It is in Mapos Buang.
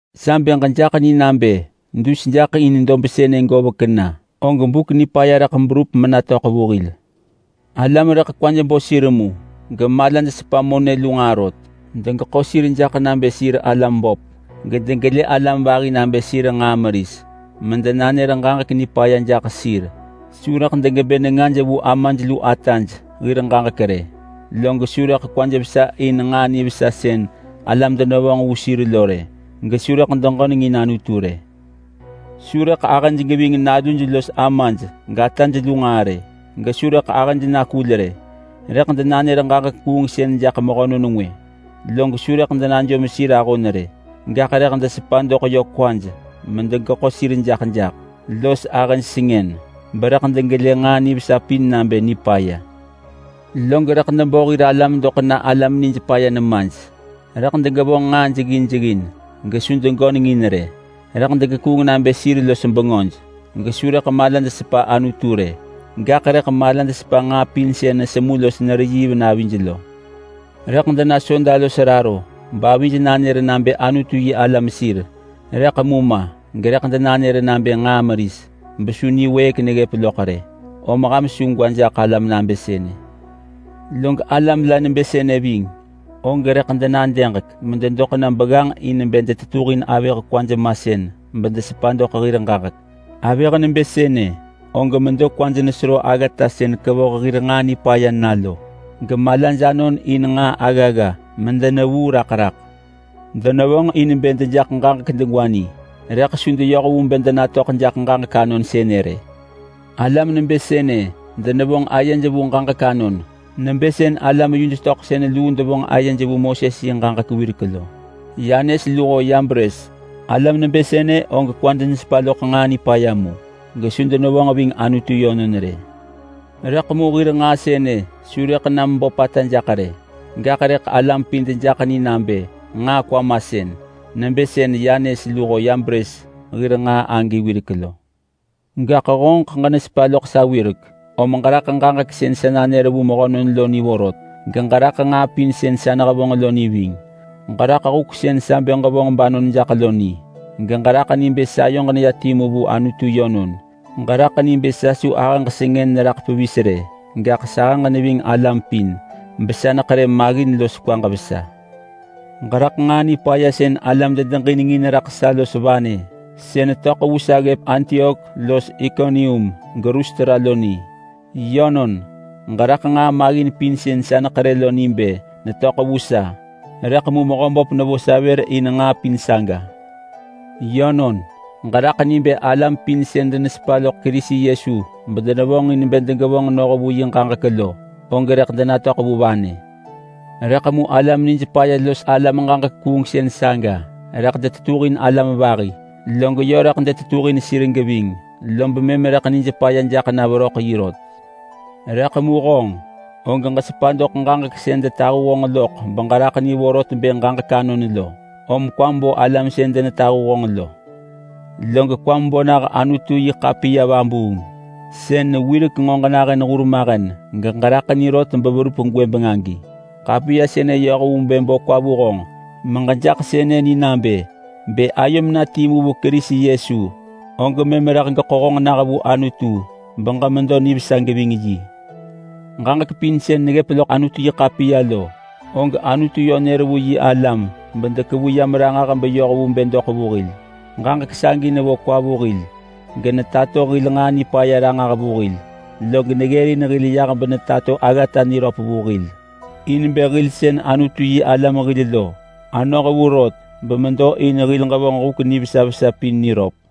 Sa bë ġejaḳ ni nabë dus jaḳ in dob sënë govek na, og buk nipaya rëḳ berup menatöḳ vu hil. Alam rëḳ kwaj bo sir mu, gemalaj sepa monë lu nġaa rot. Degeḳo sir jaḳ nabë sir alam böp gedegelë alam vahi nabë sir nġaa meris medenanër ġaġek nipaya jaḳ sir. Su rëḳ degebë nengaj vu amaj lu ataj hir ġaġek rë, log su rëḳ kwaj vesa in nġaa nivesa sën alam denevonġ vu sir lo rë. Gesu rëḳ degönengin Anutu rë. Su rëḳ ahëj geving naluj los amaj gataj lu nġaa rë, gesu rëḳ ahëj nakul rë. Rëḳ denanër ġaġek kuungsën jaḳ mehönon ngwë, log su rëḳ denajom sir ahon rë, gaḳ rëḳ desepa doḳ yö kwaj medegeḳo sir jaḳ jaḳ los ahëj sengën. Berëḳ degelë nġaa nivesa pin nabë nipaya, log rëḳ debo hir alam doḳ na alam nij paya nemaj. Rëḳ degevonġ nġaa jeggin jeggin gesu degöneng in rë. Rëḳ degekuung nabë sir los bengöj, gesu rëḳ malaj sepa Anutu rë, gaḳ rëḳ malaj sepa nġaa pin sën nesemu los nereyiiv navij lo. Rëḳ dena soda los raro bavij nanër nabë Anutu-yi-alam sir, rëḳ mu ma gerëḳ denanër nabë nġaa meris besu niwëëk neggëp loḳ rë. Om ham su gwa jaḳ alam nabë sënë. Log alam la nebë sënë ving, og rëḳ denadëġek mededoḳ na begganġ in bë detetuhin avëh kwaj masën bedesepa doḳ hir ġaġek. Avëh nebë sënë og medo mekwaj nesero aggata sën kevoh hir nġaa nipaya na lo, gemalaj anon in nġaa aggagga medenevuu raḳ raḳ. Denevonġ in bë dejaḳ ġaġek degwa ni, rëḳ su deyoh vu bë denatöḳ jaḳ ġaġek anon sënë rë. Alam nebë sënë denevonġ ayej vu ġaġek anon nebë sën alam-yuj-töḳsën luu devonġ ayej vu Moses yi ġaġek wirek lo, Yanes luho Yabres. Alam nebë sënë og kwaj nesepa loḳ nġaa nipaya mu, gesu denevonġ ving Anutu yönon rë. Rëḳ mu hir nġaa sënë su rëḳ na meböpata jaḳ rë, gaḳ rëḳ alam pin dejaḳ ni nabë nġaa kwamasën nebë sën Yanes luho Yabres hir nġaa wirek lo. Gaḳ honġeḳ ġenesepa sa wirek, om ġeraḳ ġaġek sën sa nanër vu mehönon lo ni vorot, geġeraḳ nġaa pin sën sa nehevonġ lo ni ving. Ġeraḳ huk sën sa bë ġevonġ banon jaḳ lo ni, geġeraḳ ni bë sayoġ neya timu vu Anutu yönon. Ġeraḳ ni bë sa su ahëġ sengën neraḳ pevis rë, gaḳ sahëġ neving alam pin besa neḳerë maggin los kwaġ vesa. Ġeraḳ nġaa nipaya sën alam dedeġinengin raḳ sa lo, los vanë sën töḳ vu sa ggëp Antiok los Ikonium geLustra lo ni. Yönon, ġeraḳ nġaa maggin pin sën sa neḳerë lo ni bë netöḳ vu sa, rëḳ mu Mehöböp nevo sa vër in nġaa pin saga. Yönon, ġeraḳ ni bë alam pin sën denesepa loḳ Kerisi Yesu bedenevonġin bë degevonġ noh vu yi ġaġek lo, og rëḳ denatöḳ vu vanë. Rëḳ mu alam nij paya los alam ġaġek kuungsën saga rëḳ detetuhin alam vahi. Log yö rëḳ detetuhin sir geving, lob mëm rëḳ nij paya jaḳ na veröḳ yi rot. Rëḳ mu honġ, og ġesepa doḳ ġaġek sën detahu honġ loḳ beġeraḳ ni vorot bë ġaġek anon lo. Om kwam bo alam sën denetahu honġ lo, log kwam bo nah Anutu-yi-ḳapiya vabuung, sën wirek nġo ġenahën hurmahen geġeraḳ ni rot beverup gwëbeng agi. Ḳapiya sënë yoh vu bë bo kwa vu honġ meġejaḳ sënë ni nabë: Bë ayom na timu vu Kerisi Yesu og mëm rëḳ geḳo honġ nah vu Anutu beġemedo nivesa geving yi. Ġaġek pin sën neggëp loḳ Anutu-yi-ḳapiya lo, og Anutu yö nër vu yi alam bedekevu yam ranġah beyoh vu bë doḳ vu hil. Ġaġek sagi nevo kwa vu hil, genetato hil nġaa nipaya ranġah vu hil, log neggërin hil yah benetato aggata niröp vu hil, in bë hil sën Anutu-yi-alam hil lo anoh vu rot bemedo in hil ġevonġ huk nivesa vesa pin niröp.